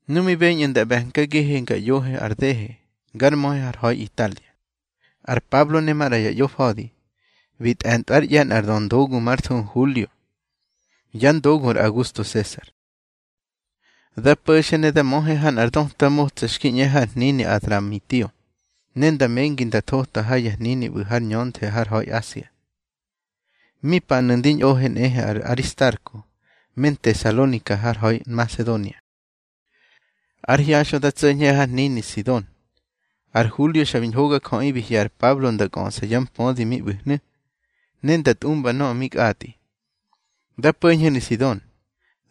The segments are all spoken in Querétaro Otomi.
Nu mi beñꞌu̱ nda ꞌbe̱nkagihe ga ꞌyohe ar dehe gár möhe har ha̱i Italia, ar Pablo ne maꞌra ya ꞌyofa̱di bi tꞌe̱ntꞌwár ꞌye̱ nꞌar döndogu már thuhu Hulio, yá ndogu ar Augusto Sesar. Da po̱xe ne da möhe ha nꞌar döta motsa xki ꞌñe har hnini Adramitio, ne nda mengi nda thota ha ya hnini ꞌbu̱ har ñönthe har ha̱i Asia. Mi panu̱ ndi ñꞌohe nꞌehe ar Aristarko me Ntesalonika har ha̱i Nmasedonia. Ár hyaxꞌö da tso̱ñhe har hnini Sidon. Ar Hulio xa bi ñhogajöꞌi bi hye̱ ar Pablo nda kꞌöꞌsa yá mpödi mi ꞌbu̱hnu̱, ne nda tꞌumba nöꞌö mi kꞌatꞌi. Da po̱ñhenu̱ Sidon,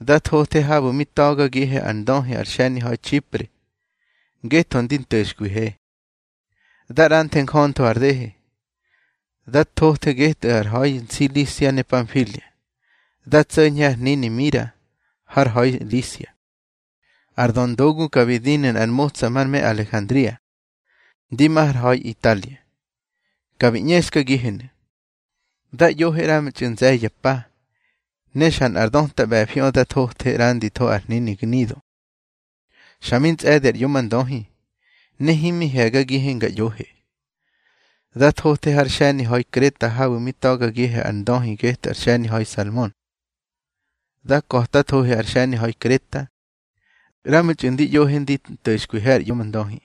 da thothe habu̱ mi ta̱gagihe ar ndöhi ar xe̱niha̱i Txipre, ngetho ndi nto̱xkwihe. Da ꞌranthe njöntho har dehe, da thothe getꞌu̱ ar ha̱i Nsilisia ne Panfilia, da tso̱ñhe har hnini Mira har ha̱i Lisia. Ar döndogu ka bi dinu̱ nꞌar motsa mar me Alejandria, ndi ma har ha̱i Italia. Ka bi ꞌñexkagihenu̱. Dá ꞌyohe ꞌramtxꞌu̱ nze̱ye̱ ya pa, xa nꞌar döta ꞌbe̱fiꞌö dá tso̱ñhe ꞌranditho ar hnini Gnido. Xa mi ntsꞌe̱di ar ꞌyomndöhi, ne himi he̱gagihe nga ꞌyohe, da thothe har xe̱niha̱i Kreta habu̱ mi ta̱gagihe ar ndöhi getꞌu̱ ar xe̱niha̱i Salmon. Da ka̱tathohe ar xe̱niha̱i Kreta, ꞌramtxꞌu̱ ndi ꞌyohe ndi nto̱xkwihe ar ꞌyomndöhi.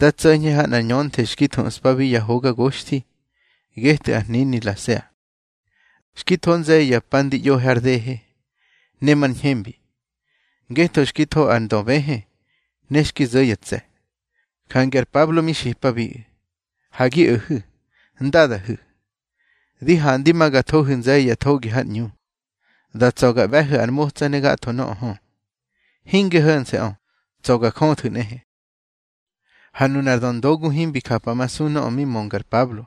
Da tso̱ñhe ha nꞌar ñönthe xki thuꞌspabi Ya Hoga Goxthi getꞌu̱ ar hnini Lasea. Xki tho nze̱ye̱ ya pa ndi ꞌyohe har dehe, ne mar ñhembi, ngetho xki tho ar ndöbëhë ne xki zo̱ ya tse̱. Jange ar Pablo mi xipabiꞌu̱: —Ha gi o̱hu̱, ndadahu̱. Di handi ma ga thohu̱ nze̱ye̱ ya thogi har ꞌñu. Da tsa̱ ga ꞌbe̱hu̱ ar motsa ne gatho nöꞌö hö. Hinge ho̱nse̱ꞌö, tsa̱ ga jöthu̱ nꞌehe. Ha nunar döndogu himbi japamasu nöꞌö mi mönga ar Pablo.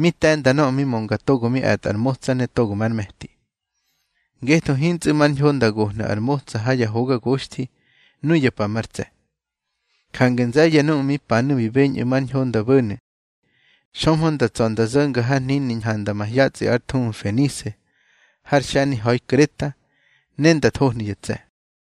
Mi te̱nda nöꞌö mi mönga togo mi e̱tꞌa ar motsa ne togo már me̱ti. Ngetho hintsꞌu̱ mar ñho nda gohnu̱ ar motsa ha Ya Hoga Goxthi nuya pa mar ntse̱. Jange nze̱ye̱ nuꞌu̱ mi panu̱ bi beñꞌu̱ mar ñho nda bo̱nu̱, xömhö nda tsa̱ nda zo̱nga har hnini ñhanda mahyatsꞌi ár thuhu Fenise har xe̱niha̱i Kreta, ne nda thohnu̱ ya tse̱.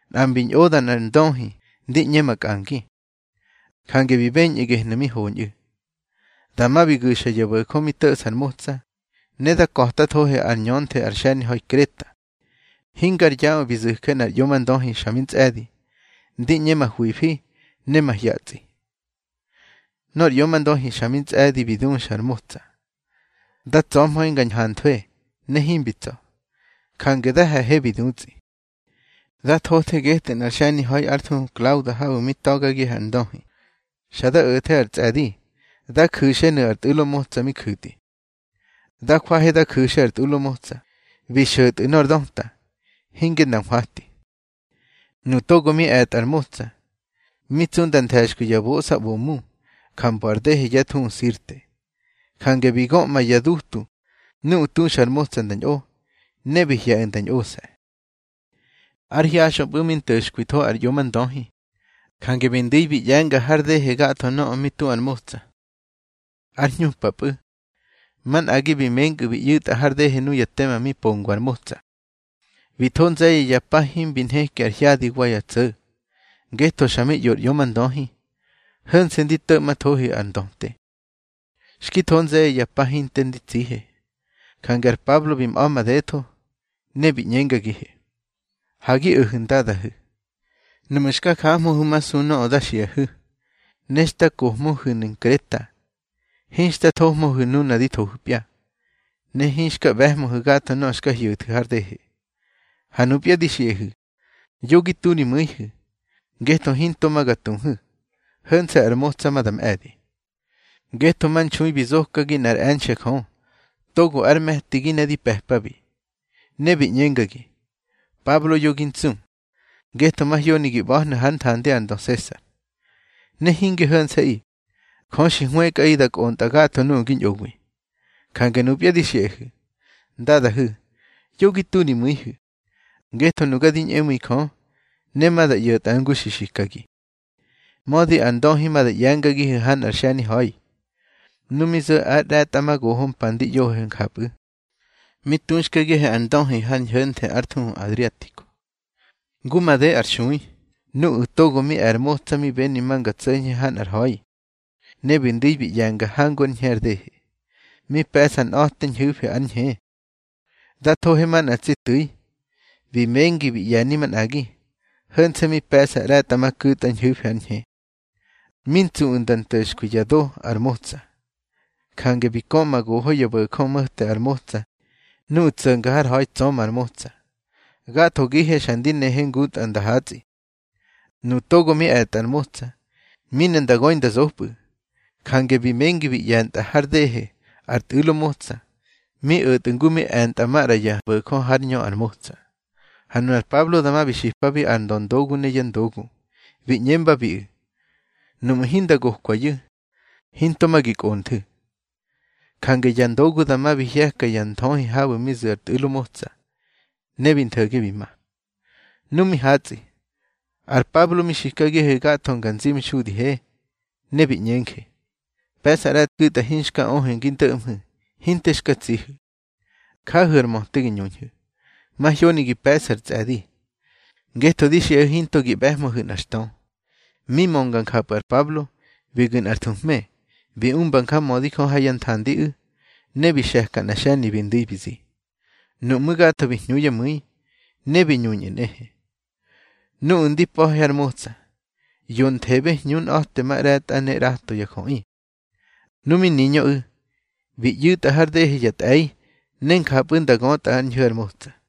Nꞌa mbi ñꞌoda nꞌar ndöhi ndi ꞌñe makꞌangi, jange bi beñꞌu̱ gehnu̱ mi hoñꞌu̱. Dama bi gu̱xa ya bo̱jö mi to̱ꞌsa ar motsa, ne da ka̱tathohe ár ñönthe ar xe̱niha̱i Kreta. Hingar yaꞌö bi zu̱je nꞌar ꞌyomndöhi xa mi ntsꞌe̱di, ndi ꞌñe mahwifi ne mahyatsꞌi. Nor ꞌyomndöhi xa mi tsꞌe̱di bi duxa ar motsa, da tsa̱hmöhe nga ñhanthwe, ne himbi tsa̱. Jange da he̱he bi dutsꞌi. Da thothe getꞌu̱ nꞌar xe̱niha̱i ár thuhu Klauda habu̱ mi ta̱gagihe ar ndöhi. Xa da o̱the ar tsꞌe̱di da ju̱xenu̱ ar tꞌu̱lo motsa mi ju̱tꞌi. Da jwahe da ju̱xe ar tꞌu̱lo motsa, bi xo̱tꞌu̱ nor döta, hinge nda nhwati. Nuꞌu̱ togo mi e̱tꞌa ar motsa, mi tsu nda nthe̱xkwi ya boꞌsaꞌbomu ja mbo ar dehe yá thuhu Sirte. Jange bi göꞌma ya dutu nuꞌu̱ tuxa ar motsa nda ñꞌo, ne bi hye̱ꞌu̱ nda ñꞌose̱. Ár hyaxꞌöpꞌu̱ mi nto̱xkwitho ar ꞌyomndöhi, jange bi ndu̱i bi ꞌye̱nga har dehe gatho nöꞌö mi tu ar motsa. Ár hñupapꞌu̱, manꞌagi bi menkꞌu̱ bi ꞌyu̱tꞌa har dehe nuya tema pongwa ar motsa. Bi tho nze̱ye̱ ya pa himbi nheki ar hyadi wa ya tso̱, ngetho xa mi ꞌyo ar ꞌyomndöhi. Ho̱nse̱ ndi to̱ꞌmthohe ar ndöte. Xki tho nze̱ye̱ ya pa hinte ndi tsihe, jange ar Pablo bi mꞌa̱ madetho, ne bi ꞌñengagihe: —Ha gi o̱hu̱, ndadahu̱. Nuꞌmu̱ xka jahmöhu̱masu nöꞌö da xiꞌahu̱, ne xta kohmöhu̱nu̱ Nkreta, hinxta thohmöhu̱ nuna di thohu̱pya, ne hinxka ꞌbe̱hmöhu̱ gatho nöꞌö xka hyo̱thu̱ har dehe. Ha nupya di xiꞌahu̱, yo gi tu ri mu̱ihu̱, ngetho hinto ma ga tuhu̱, ho̱nse̱ ar motsa ma da mꞌe̱di. Ngetho manxui bi zokagi nꞌár e̱nxe̱ Jö, togo ár me̱tigi ne di pe̱pabi. Ne bi ꞌñengagi: Pablo, yo gi ntsu, ngetho mahyoni gi ꞌba̱hnu̱ hár nthandi ar ndö Sesar. Ne hinge ho̱nse̱ꞌi, Jö xi hwëkꞌaꞌi da kꞌontꞌa gatho nuꞌu̱ gi ñꞌowi. Jange nupya di xiꞌahu̱, ndadahu̱, yo gi tu ri mu̱ihu̱, ngetho nuga di ñꞌemu̱i Jö, ne ma da ꞌyo̱tꞌa ngu xi xikagi. Mödi ar ndöhi ma da ꞌye̱ngagihu̱ ha nꞌar xe̱niha̱i. Nu mi zo̱ ár ꞌre̱tꞌamagoho mpa ndi ꞌyohe njapꞌu̱, mi tuxkagihe ar ndöhi har ñho̱nthe ár thuhu Adriatico. Ngu made ar xui, nuꞌu̱ togo mi e̱ ar motsa mi beni ma nga tso̱ñhe ha nꞌar ha̱i. Ne bi ndu̱i bi ꞌye̱nga hangu ár ñhe ar dehe. Mi pe̱ꞌsa nꞌa̱te ñhu̱fi ár ñhe. Da thohe manꞌa tsi tu̱i, bi mengi bi ꞌye̱ni manꞌagi. Ho̱nse̱ mi pe̱ꞌsa ꞌre̱tꞌamaku̱tꞌa ñhu̱fi ár ñhe. Mi ntsuꞌu̱ nda nto̱xkwi ya do ar motsa, jange bi köꞌma goho ya bo̱jö mo̱te ar motsa nuꞌu̱ tso̱nga har ha̱i, tsöma ar motsa. Gathogihe xa ndi nehe ngutꞌa nda hatsꞌi. Nuꞌu̱ togo mi e̱tꞌa ar motsa, mi ne nda göi nda zopꞌu̱. Jange bi mengi bi ꞌye̱ntꞌa har dehe ar tꞌu̱lo motsa, mi o̱tꞌu̱ ngu mi e̱ntꞌa maꞌra ya bo̱jö hár ñö ar motsa. Ha nunar Pablo dama bi xipabi ar döndogu ne yá ndogu, bi ꞌñembabiꞌu̱: —Nuꞌmu̱ hinda gokwayu̱, hinto ma gi kꞌonthu̱. Jange ya ndogu dama bi hye̱ka ya nthöhi habu̱ mi zu̱ ar tꞌu̱lo motsa, ne bi ntho̱ge bi ma. Nu mi hatsꞌi, ar Pablo mi xikagihe gatho nga nzimxudihe, ne bi ꞌñenje: —Pe̱ꞌsa ꞌre̱tku̱tꞌa hinxka öhu̱ ngi ndo̱ꞌmhu̱, hinte xka tsihu̱. Jahu̱ ar möte gi ñuñhu̱. Mahyoni gi pe̱ꞌsu̱ ar tsꞌe̱di, ngetho di xiꞌahu̱ hinto gi ꞌbe̱hmöhu̱ nꞌar xtö. Mi mönga njapꞌu̱ ar Pablo, bi gu̱ nꞌar thuhme, bi umba njamödi Jö ha yá nthandiꞌu̱. Ne bi xe̱ka nꞌa xe̱ni bi ndu̱i bi zi. Nuꞌmú̱ gatho bi hñu yá mu̱i, ne bi ñuñꞌu̱ nꞌehe. Nuꞌu̱ ndi pa̱he har motsa, yonthebe hñunꞌa̱temaꞌre̱tꞌa ne ꞌrato ya jöꞌi. Nu mi niñöꞌu̱, bi ꞌyu̱tꞌa har dehe ya tꞌe̱i, ne njapꞌu̱ nda götꞌa ár ñhu̱ ar motsa.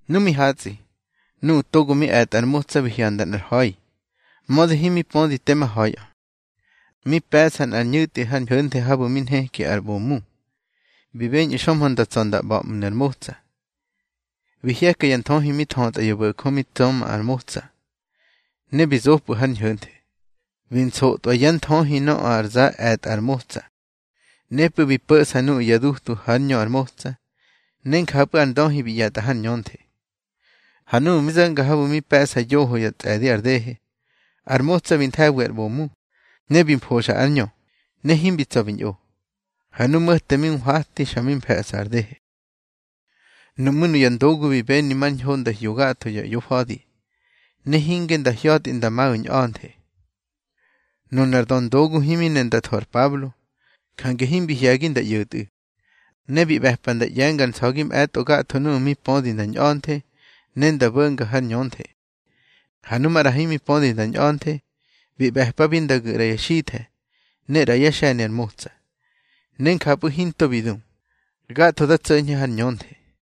Nu mi hatsꞌi, nuꞌu̱ togo mi e̱tꞌa ar motsa bi hyanda nꞌar ha̱i, mödi himi pödi tema ha̱iꞌö. Mi pe̱ꞌsa nꞌar ñu̱tꞌi har ñönthe habu̱ mi nheki ar ꞌbomu. Bi beñꞌu̱ xömhö nda tsa̱ nda ꞌba̱ꞌmnu̱ ar motsa. Bi hye̱ka ya nthöhi mi thötꞌa ya bo̱jö mi tsöma ar motsa, ne bi zopꞌu̱ har ñho̱nthe. Bi nsotꞌwa yá nthöhi nöꞌö ar za e̱tꞌa ar motsa. Nepꞌu̱ bi po̱ꞌsa nuꞌu̱ ya dutu hár ñö ar motsa, ne njapꞌu̱ ar ndöhi bi ꞌye̱tꞌa har ñönthe. Ha núꞌmu̱ mi zo̱nga habu̱ mi pe̱ꞌsa yoho ya tsꞌe̱di ar dehe, ar motsa bi nthe̱wi ar ꞌbomu, ne bi mfoxa ár ñö, ne himbi tsa̱ bi ñꞌo. Ha nu mo̱te mi nhwati xa mi fe̱ꞌsa ar dehe. Nuꞌmú̱ nuya ndogu bi beni mar ñho nda hyo gatho ya ꞌyofa̱di, ne hinge nda hya̱tꞌi nda maꞌu̱ ñꞌa̱nthe. Nunar döndogu himi ne nda tho ar Pablo, jange himbi hye̱gi nda ꞌyo̱tꞌu̱. Ne bi ꞌbe̱pa nda ꞌye̱ngar nsa̱gi mꞌe̱tꞌo gatho nuꞌu̱ mi pödi nda ñꞌa̱nthe, ne nda bo̱nga har ñönthe. Ha nu maꞌra himi pödi nda ñꞌa̱nthe, bi ꞌbe̱pabi nda gu̱ ꞌra ya xithe̱ ne ꞌra yá xe̱ni ar motsa. Ne njapꞌu̱ hinto bi du, gatho da tso̱ñhe har ñönthe.